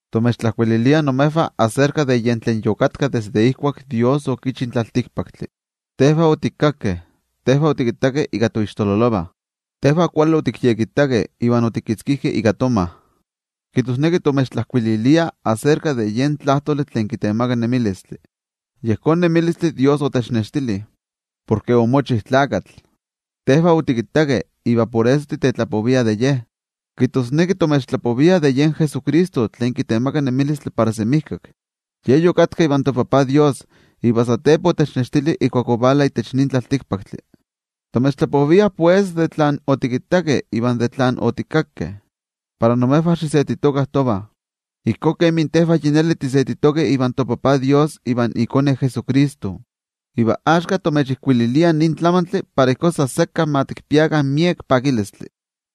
Timechtlajkuililiah imejvah aserka de yen tlen yokatka desde ijkuak toYejwatzi okichi in tlaltikpaktli. Tejvah otikakkeh, tejvah otikittakeh ika toixtololovah, tejvah kuali otikyekittakeh iva otikitzkijkeh ika tomah. Kijtosneki timechtlajkuililiah aserka de yen Tlajtoli tlen kitemaka nemilistli. Yejón nemilistli toYejwatzi otechnextili, porke omochi Tlakatl. Tejvah otikittakeh iva por eso titetlapoviah de Ye. Kijtosneki timechtlapoviah de yen Jesucristo tlen kitemaka nemilistli para semijkak. Ye yokatka ivan toTajtzin Dios, iva satepa otechnextili ijkuak ovala itech nin tlaltikpaktli. Timechtlapoviah, pues, de tlen otikittakeh iva de tlen otikakkeh, para imejvah xisetitokah tovah, ijkó kemi tejvah yi neli tisetitokeh ivan toTajtzin Dios ivan iKone Jesucristo. Iva axka timechijkuililiah nin tlamantli para ijkó san sekka ma tikpiakah miek pakilistli.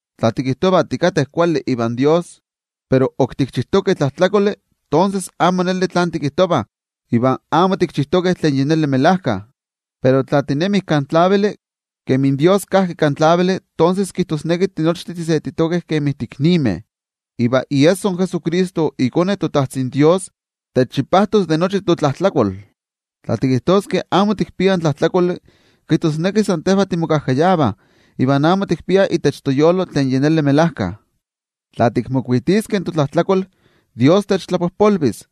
Tla tikijtovah tikateh kuali ivan toYejwatzi, pero ok tikchijtokeh tlajtlakoli, tonses amo neli tlen tikijtovah iva amo tikchijtokeh tlen melajkayotl. Pero tla tinemih kan tlavili, kemi toYejwatzi kajki kan tlavili, tonses kijtosneki tinochtin tisetitokeh kemi tiiknimeh, iva iesso in Jesucristo iKone in Dios, techchipajtos de nochi totlajtlakol. Tla tikijtoskeh amo tikpiah tlajtlakoli, kijtosneki san tejvah timokajkayavah iva amo tikpiah itech toyolo in melajkayotl. Tla tikmokuitiskeh totlajtlakol, in toYejwatzi techtlapojpolvis. In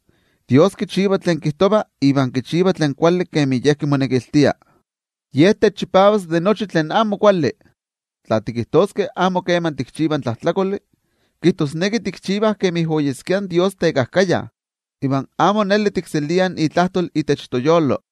toYejwatzi kichiva tlen kijtova iva kichiva tlen kuali kemi Ye kimonekiltia. Ye techchipavas de nochi tlen amo kuali. Tla tikijtoskeh amo keman tikchivah tlajtlakoli, kijtosneki tikchivah kemi oyeskia tekajkaya in toYejwatzi, iva amo neli tikseliah itlajtol itech toyolo.